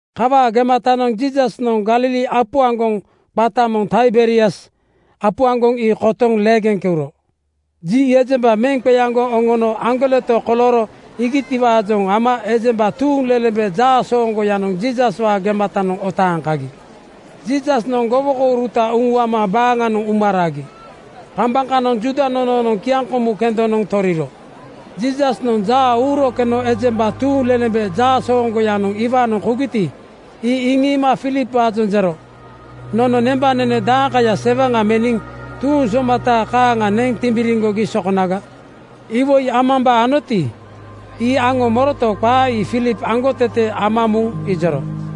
Kawaa gematanoŋ Jiisasnoŋ Galili apu aŋgoŋ, qata moŋ Taiberias apu aŋgoŋ ii kotoŋ leegeŋ keuro. Ji ejemba meŋ qeaŋgoŋ oŋono aŋgoleto kolooro iigitiwaajoŋ ama ejemba tuuŋlelembe jaasooŋgoyanoŋ Jiisaswaa gematanoŋ otaaŋ kagi. Jiisasnoŋ gowokouruta uŋuama baaŋanoŋ uma ragi. Kambaŋ kanoŋ Juuda nonoonoŋ kiaŋkomu kendonoŋ toriro. Jiisasnoŋ jaa uuro keno ejemba tuuŋlelembe jaasooŋgoyanoŋ iwaanoŋ kougiti, ii iŋiima Filipwaajoŋ jero, “Nono nembanene daeŋkaya sewaŋa meniŋ tuuŋ somata kaaŋa neŋ timbiriŋgogi sokonaga?” Iwoi amambaa anoti, ii aŋo moroto, qaa ii Filip aŋgotete ama muŋ ijoro.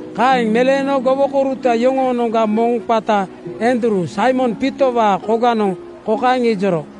Kaeŋ meleeno gowokouruta yoŋoonoŋga moŋ qata Andruu, Saimon Piitowaa koganoŋ kokaeŋ ijoro,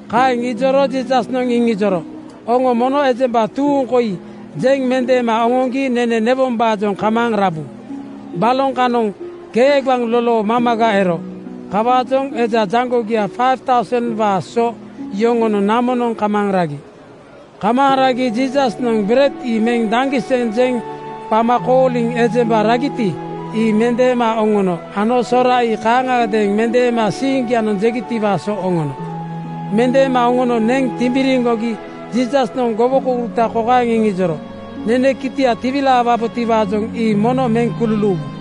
Kaeŋ ijoro Jiisasnoŋ iŋijoro, “Oŋo mono ejemba tuuŋ koi jeŋ mendeema oŋoŋgi nene newombaajoŋ kamaaŋ rabu.” Baloŋ kanoŋ kegbaŋ lolo mamaga ero. Kawaajoŋ eja jaŋgogia 5,000:waa so yoŋonoŋ namonoŋ kamaaŋ ragi. Kamaaŋ ragi Jiisasnoŋ bered ii meŋ daŋgiseŋ jeŋ qama kooliŋ ejemba ragiti, ii mendeema oŋono ano sora ii kaaŋagadeeŋ mendeema siiŋgianoŋ jegitiwaa so oŋono. Mendeema oŋono neŋ timbiriŋgogi Jiisasnoŋ gowokouruta kokaeŋ iŋijoro, “Nene kitia tiwilaawabotiwaajoŋ ii mono meŋ kululuuwu.”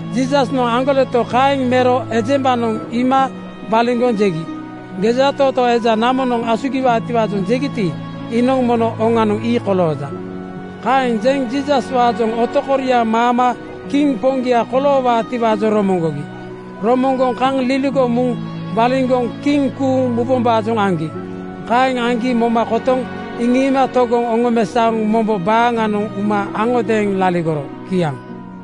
Jiisasnoŋ aŋgoleto kaeŋ mero ejembanoŋ iima waliŋgoŋ jegi, “Gejatootoo eja namonoŋ asugiwaatiwaajoŋ jegiti, iinoŋ mono oŋanoŋ ii kolooja.” Kaeŋ jeŋ Jiisaswaajoŋ otokoriaŋ maama kiŋ poŋgia koloowaatiwaajoŋ romoŋgogi. Romoŋgoŋ kaŋ liligoŋ muŋ waliŋgoŋ kiŋ kuuŋ mubombaajoŋ aŋgi. Kaeŋ aŋgi moma kotoŋ iŋiima togoŋ oŋomesaoŋ mombo baaŋanoŋ uma aŋodeeŋ laligoro. Kiaŋ.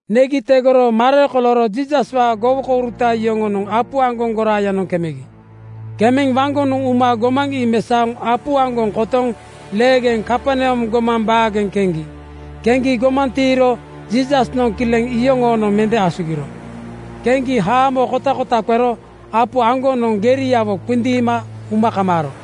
Negi tegoro mare kolooro Jiisaswaa gowokouruta yoŋonoŋ apu aŋgoŋ goraayanoŋ kemegi. Kemeŋ waŋgonoŋ uma gomaŋ ii mesaoŋ apu aŋgoŋ kotoŋ leegeŋ Kaperneam gomaŋ baageŋ keŋgi. Keŋgi gomaŋ tiiro Jiisasnoŋ kileŋ yoŋoonoŋ mende asugiro. Keŋgi haamo kotakota qero apu aŋgonoŋ geriawo qindiima uma kamaaro.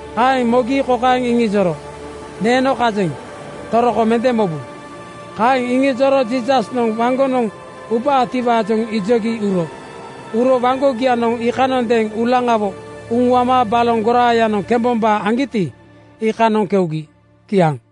Kaeŋ mogi kokaeŋ iŋijoro, “Neeno kajeŋ. Toroko mende mobu.” Kaeŋ iŋijoro Jiisasnoŋ waŋgonoŋ ubaatiwaajoŋ ijogi uro. Uro waŋgogianoŋ iikanondeeŋ uulaŋawo uŋuama baloŋ goraayanoŋ kembombaa aŋgiti, iikanoŋ keugi. Kiaŋ.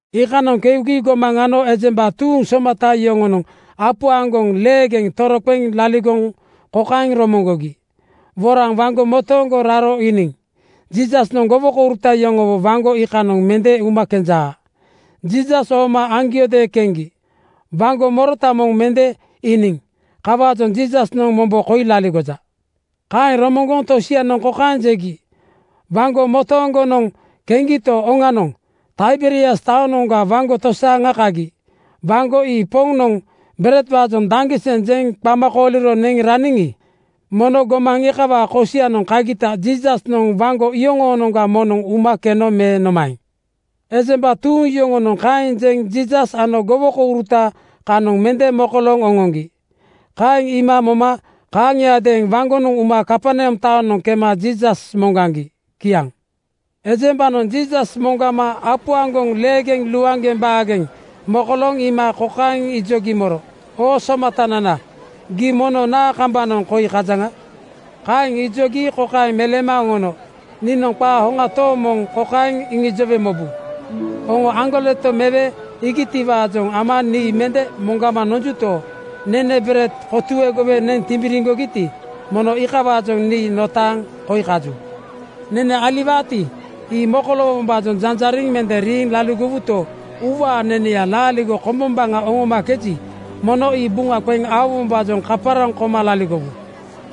Iikanoŋ keugi gomaŋ ano ejemba tuuŋ somata yoŋonoŋ apu aŋgoŋ leegeŋ toroqeŋ laligoŋ kokaeŋ romoŋgogi, “Woraŋ waŋgo motooŋgonoŋ raro iiniŋ Jiisasnoŋ gowokouruta yoŋowo waŋgo iikanoŋ mende uma kenjaa. Jiisas ooma aŋgiodeeŋ keŋgi. Waŋgo morota moŋ mende iiniŋ. Kawaajoŋ Jiisasnoŋ mombo koi laligoja.” Kaeŋ romoŋgoŋ tosianoŋ kokaeŋ jegi, “Waŋgo motooŋgonoŋ keŋgito, oŋanoŋ, Taiberias taonoŋa waŋgo tosaaŋa kagi. Waŋgo ii Poŋnoŋ beredwaajoŋ daŋgiseŋ jeŋ qama kooliro neŋ raniŋi, mono gomaŋ iikawaa kosianoŋ kagita Jiisasnoŋ waŋgo iyoŋoonoŋga moŋnoŋ uma keno me nomaeŋ?” Ejemba tuuŋ yoŋonoŋ kaeŋ jeŋ Jiisas ano gowokouruta kanoŋ mende mokolooŋ oŋoŋgi. Kaeŋ iima moma kaaŋiadeeŋ waŋgonoŋ uma Kaperneam taonoŋ kema Jiisas moŋgaŋgi. Kiaŋ. Ejembanoŋ Jiisas moŋgama apu aŋgoŋ leegeŋ luaŋgeŋ baageŋ mokolooŋ iima kokaeŋ ijogi moro, “Oo Somatanana, gii mono naa kambanoŋ koi kajaŋa?” Kaeŋ ijogi kokaeŋ meleema oŋono, “Niinoŋ qaa hoŋa tooŋ moŋ kokaeŋ iŋijowe mobu: Oŋo aŋgoleto mewe iigitiwaajoŋ ama nii mende moŋgama nonjuto, nene bered kotuegowe neŋ timbiriŋgogiti, mono iikawaajoŋ nii notaaŋ koi kaju. Nene aliwaati, ii mokoloowombaajoŋ janjariŋ mende riiŋ laligowuto, uuwaa neneya laaligo kombombaŋa oŋomakeji, mono ii buŋa qeŋ aowombaajoŋ kaparaŋ koma laligowu.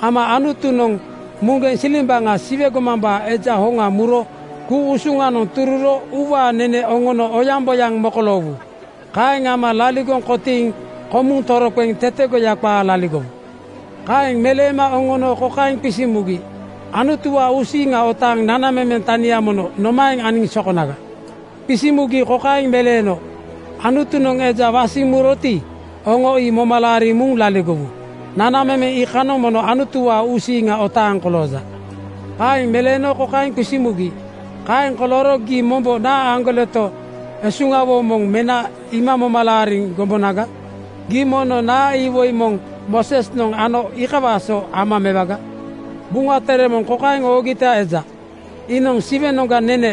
Ama Anutunoŋ muŋgeŋ silimbaŋa Siwe gomambaa Eja Hoŋa muro ku-usuŋanoŋ tururo uuwaa nene oŋono oyaŋboyaŋ mokoloowu. Kaeŋ ama laligoŋ kotiiŋ komuŋ toroqeŋ tetegoya qaa laligowu.” Kaeŋ meleema oŋono kokaeŋ qisiŋ mugi, “Anutuwaa uusiiŋa otaaŋ nanamemeŋ tania mono nomaeŋ aniŋ sokonaga?” Qisiŋ mugi kokaeŋ meleeno, “Anutunoŋ eja wasiŋ muroti, oŋo ii moma laariŋ muŋ laligowu. Nanamemeŋ iikanoŋ mono Anutuwaa uusiiŋa otaaŋ kolooja.” Kaeŋ meleeno kokaeŋ qisiŋ mugi, “Kaeŋ kolooro gii mombo naa aŋgoletoga esuŋawo moŋ mena iima moma laariŋ gombonaga? Gii mono naa iwoi moŋ Moosesnoŋ ano, iikawaa so ama mewaga? Buŋa Tere moŋ kokaeŋ oogita eja, ‘Iinoŋ Siwenoŋga nene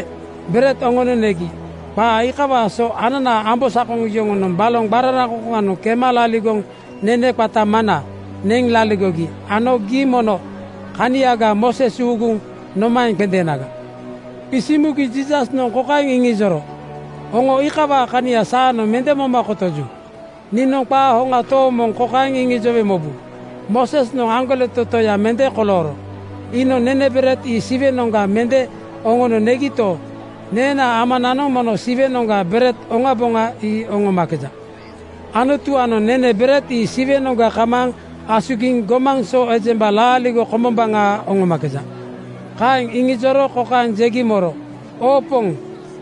bered oŋono negi.’ Qaa iikawaa so ananaa ambosakoŋ yoŋonoŋ baloŋ qararaŋkoŋkoŋanoŋ kema laligoŋ nene qata “mana” neŋ laligogi ano gii mono kaniaga Mooses uuguŋ nomaeŋ qendeenaga? Qisiŋ mugi Jiisasnoŋ kokaeŋ iŋijoro, “Oŋo iikawaa kania saanoŋ mende moma kotoju. Niinoŋ qaa hoŋa tooŋ moŋ kokaeŋ iŋijowe mobu: Moosesnoŋ aŋgoleto Toya mende kolooro. Iinoŋ nene bered ii Siwenoŋga mende oŋono negito, neenaa Amananoŋ mono Siwenoŋga bered oŋaboŋa ii oŋomakeja. Anutuwaanoŋ nene bered ii Siwenoŋga kamaaŋ asugiŋ gomaŋ so ejemba laaligo kombombaŋa oŋomakeja.” Kaeŋ iŋijoro kokaeŋ jegi moro, “Oo Poŋ,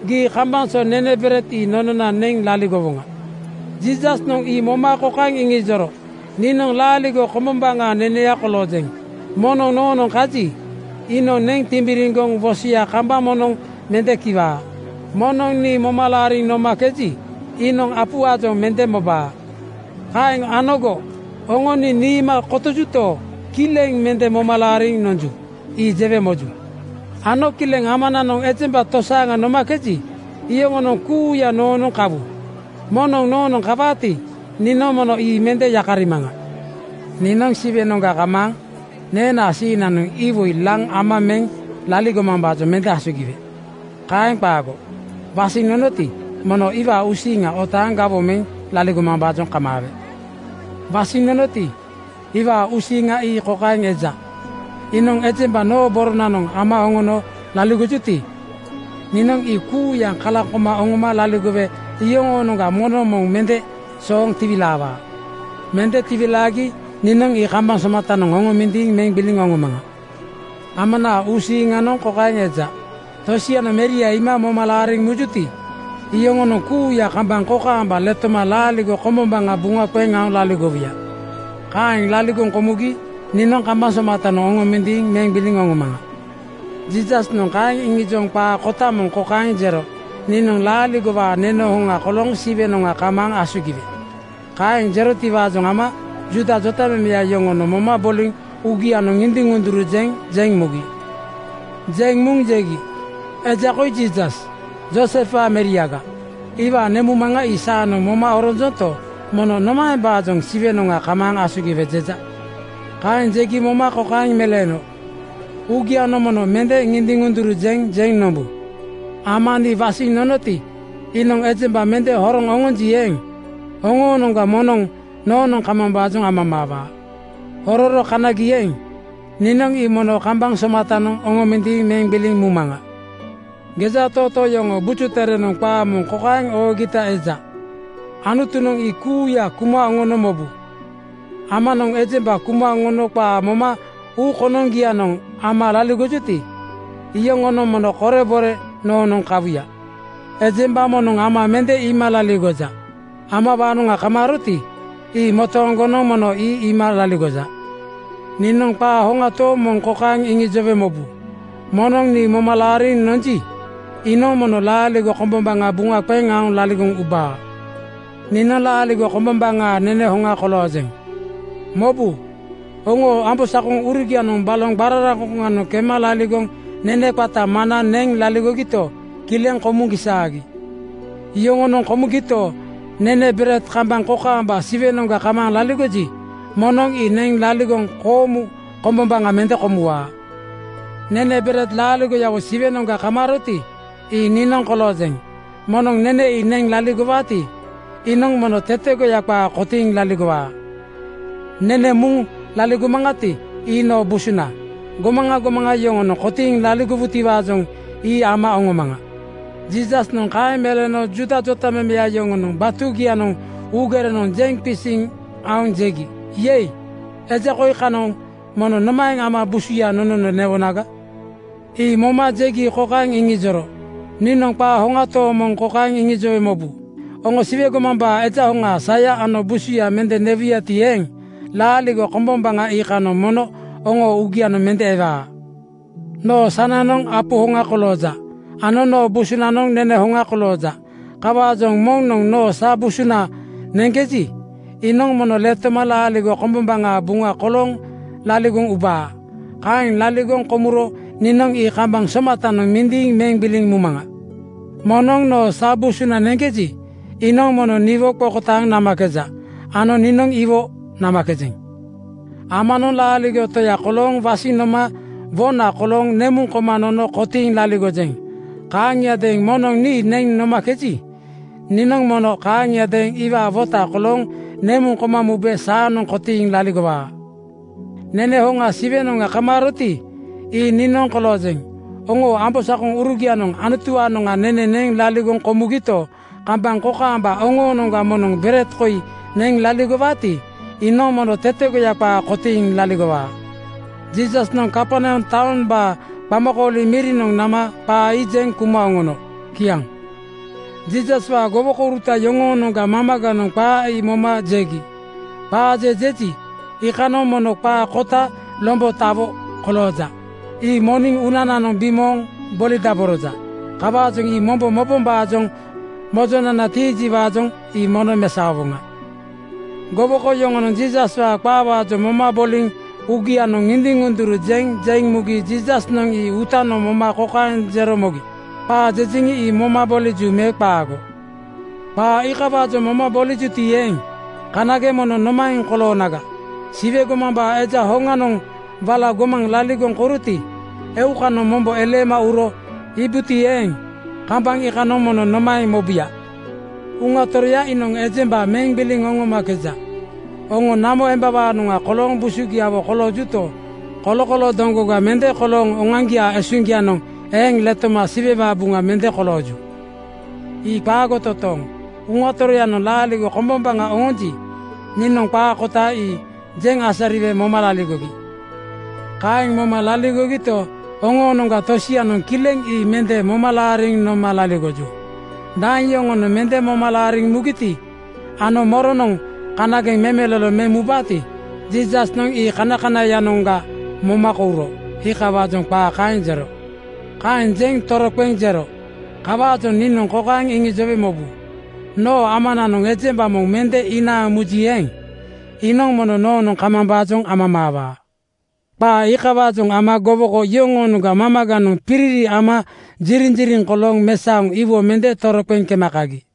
gii kambaŋ so nene bered ii nonona neŋ laligowoŋa.” Jiisasnoŋ ii moma kokaeŋ iŋijoro, “Niinoŋ laaligo kombom-baŋaa neneya koloojeŋ. Moŋnoŋ noonoŋ kaji, iinoŋ neŋ timbiriŋgoŋ wosoya kambaŋ moŋnoŋ mende kiwaa. Moŋnoŋ nii moma laariŋ nomakeji, iinoŋ apuwaajoŋ mende mobaa. Kaeŋ anogo oŋo nii niima kotojuto, kileŋ mende moma laariŋ nonju. Ii jewe moju. Ano kileŋ Amanoŋ ejemba tosaaŋa nomakeji, iyoŋonoŋ kuuya noonoŋ kawu. Moŋnoŋ noonoŋ kawaati, niinoŋ mono ii mende yakarimaŋa. “Niinoŋ Siwenoŋga kamaaŋ neenaa siiŋnanoŋ iwoi laŋ ama meŋ laligomambaajoŋ mende asugiwe. Kaeŋ qaago. Wasiŋ nonoti, mono iwaa uusiiŋa otaaŋ gawoŋ meŋ laligomambaajoŋ kamaawe. “Wasiŋ nonoti, iwaa uusiiŋa ii kokaeŋ eja: Iinoŋ ejemba noo boronanoŋ ama oŋono laligojuti, niinoŋ ii kuuya kalaŋ koma oŋoma laligowe iyoŋoonoŋga moŋnoŋ moŋ mende sooŋ tiwilaawaa. Mende tiwilaagi niinoŋ ii kambaŋ somatanoŋ oŋomindiiŋ meŋ gbiliŋ oŋomaŋa. “Amanaa uusiiŋanoŋ kokaeŋ eja: Tosianoŋ Meria iima moma laariŋ mujuti, iyoŋonoŋ kuuya kambaŋ kokaamba letoma laaligo kombombaŋa buŋa qeŋ aoŋ laligowuya. Kaeŋ laligoŋ komugi niinoŋ ii kambaŋ somatanoŋ oŋomindiiŋ meŋ gbiliŋ oŋomaŋa.” Jiisasnoŋ kaeŋ iŋijoŋ qaa kota moŋ kokaeŋ jero, “Niinoŋ laaligowaa nene hoŋa kolooŋ Siwenoŋa kamaaŋ asugiwe.” Kaeŋ jerotiwaajoŋ ama Juuda jotamemeya yoŋonoŋ moma boliŋ uugianoŋ ŋindiŋ-ŋunduru jeŋ jeŋ mugi. Jeŋ muŋ jegi, “Eja koi Jiisas, Joosefwaa meriaga. Iwaa nemuŋmaŋa ii saanoŋ moma oronjonto, mono nomaembaajoŋ ‘Siwenoŋa kamaaŋ asugiwe,’ jeja?” Kaeŋ jegi moma kokaeŋ meleeno, “Uugianoŋ mono mende ŋindiŋ-ŋunduru jeŋ jeŋ nombu. Ama nii wasiŋ nonoti, iinoŋ ejemba mende horoŋ oŋonji eeŋ, oŋoonoŋga moŋnoŋ noonoŋ kamambaajoŋ amamaawaa. Hororo kanagi eeŋ, niinoŋ ii mono kambaŋ somatanoŋ oŋomindiiŋ meŋ gbiliŋ mumaŋa. “Gejatootoo yoŋoo Buju Terenoŋ qaa moŋ kokaeŋ oogita eja, ‘Anutunoŋ ii kuuya kuma oŋono mobu.’ Amanoŋ ejemba kuma oŋono qaa moma uu konoŋgianoŋ ama laligojuti, iyoŋonoŋ mono korebore noonoŋ kawuya. Ejemba moŋnoŋ Ama mende iima laligoja. Amawaanoŋa kamaaroti, ii motooŋgonoŋ mono ii iima laligoja. Niinoŋ qaa hoŋa tooŋ moŋ kokaeŋ iŋijowe mobu: Moŋnoŋ nii moma laariŋ nonji, iinoŋ mono laaligo kombombaŋa buŋa qeŋ aoŋ laligoŋ ubaa. “Niinoŋ laaligo kombombaŋaa nene hoŋa koloojeŋ. Mobu! Oŋoo ambosakoŋurugianoŋ baloŋ qararaŋkoŋkoŋanoŋ kema laligoŋ nene qata mana neŋ laligogito, kileŋ komuŋ gisaagi. Yoŋonoŋ komugito, nene bered kambaŋ kokaamba Siwenoŋa kamaaŋ laligoji, moŋnoŋ ii neŋ laligoŋ koomu kombombaŋa mende komuwaa. “Nene bered laaligoyawo Siwenoŋa kamaaroti, ii niinoŋ koloojeŋ. Moŋnoŋ nene ii neŋ laligowaati, iinoŋ mono tetegoya qaa kotiiŋ laligowaa. Nene muŋ laligomaŋati, ii noo busuna. Gomaŋa gomaŋa yoŋonoŋ kotiiŋ laligowutiwaajoŋ ii ama oŋomaŋa.” Jiisasnoŋ kaeŋ meleeno Juuda jotamemeya yoŋonoŋ batugianoŋ uugerenoŋ jeŋ qisiŋ aoŋ jegi, “Yei! Eja koi kanoŋ mono nomaeŋ ama busuya nonono newonaga?” Ii moma jegi kokaeŋ iŋijoro, “Niinoŋ qaa hoŋa tooŋ moŋ kokaeŋ iŋijowe mobu: Oŋo Siwe gomambaa Eja Hoŋaa saya ano busuya mende newuyati eeŋ, laaligo kombombaŋa iikanoŋ mono oŋoo uugianoŋ mende ewaa. Noo sananoŋ apu hoŋa kolooja ano noo busunanoŋ nene hoŋa kolooja. Kawaajoŋ moŋnoŋ noo sa busuna neŋkeji, iinoŋ mono letoma laaligo kombombaŋaa buŋa kolooŋ laligoŋ ubaa. Kaeŋ laligoŋ komuro niinoŋ ii kambaŋ somatanoŋ mindiiŋ meŋ gbiliŋ mumaŋa. “Moŋnoŋ noo sa busuna neŋkeji, iinoŋ mono niwo qokotaaŋ namakeja ano niinoŋ iwo namakejeŋ. Amanoŋ Laaligo Toya kolooŋ wasiŋ noma wona kolooŋ nemuŋ koma nono kotiiŋ laligojeŋ. Kaaŋiadeeŋ moŋnoŋ nii neŋ nomakeji, niinoŋ mono kaaŋiadeeŋ iwaa wota kolooŋ nemuŋ koma mube saanoŋ kotiiŋ laligowaa. Nene hoŋa Siwenoŋa kamaaroti, ii niinoŋ koloojeŋ. Oŋoo ambosakoŋurugianoŋ Anutuwaanoŋ nene neŋ laligoŋ komugito, kambaŋ kokaamba oŋoonoŋga moŋnoŋ bered koi neŋ laligowaati, iinoŋ mono tetegoya qaa kotiiŋ laligowaa.” Jiisasnoŋ Kaperneam taombaa qamakooli mirianoŋ nama qaa ii jeŋ kuma oŋono. Kiaŋ. Jiisaswaa gowokouruta yoŋoonoŋga mamaganoŋ qaa ii moma jegi, “Qaa je jeji, iikanoŋ mono qaa kota lombotawo kolooja. Ii moniŋ uunananoŋ bimooŋ bolidaboroja. Kawaajoŋ ii mombo mobombaajoŋ mojonana tiijiwaajoŋ ii mono mesaowoŋa.” Gowoko yoŋonoŋ Jiisaswaa qaawaajoŋ moma boliŋ uugianoŋ ŋindiŋ-ŋunduru jeŋ jeŋ mugi Jiisasnoŋ ii uutanoŋ moma kokaeŋ jero mogi, “Qaa jejeŋi, ii moma boliju me qaago? Qaa iikawaajoŋ moma bolijuti eeŋ, kanageŋ mono nomaeŋ koloonaga? Siwe gomambaa Eja hoŋanoŋ wala gomaŋ laligoŋ kouroti, eukanoŋ mombo eleema uro iibuti eeŋ, kambaŋ iikanoŋ mono nomaeŋ mobuya? “Uŋa Toroya iinoŋ ejemba meŋ gbiliŋ oŋomakeja. Oŋo namo embawaanoŋa kolooŋ busugiawo koloojuto, kolokoloo doŋgoganoŋ mende kolooŋ oŋoaŋgiaa esuŋgianoŋ eeŋ letoma Siwewaa buŋa mende kolooju. Ii qaago totooŋ. Uŋa Toroyanoŋ laaligo kombombaŋa oŋonji, niinoŋ qaa kota ii jeŋ asariwe moma laligogi. Kaeŋ moma laligogito, oŋoonoŋga tosianoŋ kileŋ nii mende moma laariŋ noma laligoju.” Daeŋ yoŋonoŋ mende moma laariŋ mugiti ano moronoŋ kanageŋ memelolo meŋ mubaati, Jiisasnoŋ ii kanakanaiyanoŋga moma kouro. Iikawaajoŋ qaa kaeŋ jero. Kaeŋ jeŋ toroqeŋ jero, “Kawaajoŋ niinoŋ kokaeŋ iŋijowe mobu: Noo Amananoŋ ejemba moŋ mende inaaŋ muji eeŋ, iinoŋ mono noonoŋ kamambaajoŋ amamaawaa.” Qaa iikawaajoŋ ama gowoko iyoŋoonoŋga mamaganoŋ piriri ama ziriŋziriŋ kolooŋ mesaoŋ iwo mende toroqeŋ kema kagi.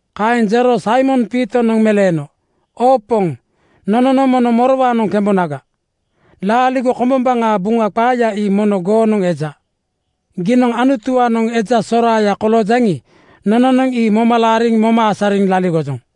Kaeŋ jero Saimon Piitonoŋ meleeno, “Oo Poŋ, nononoŋ mono morowaanoŋ kembonaga? Laaligo kombombaŋaa Buŋa qaaya ii mono goonoŋ eja. Giinoŋ Anutuwaanoŋ eja soraaya koloojaŋi, nononoŋ ii moma laariŋ moma asariŋ laligojoŋ.”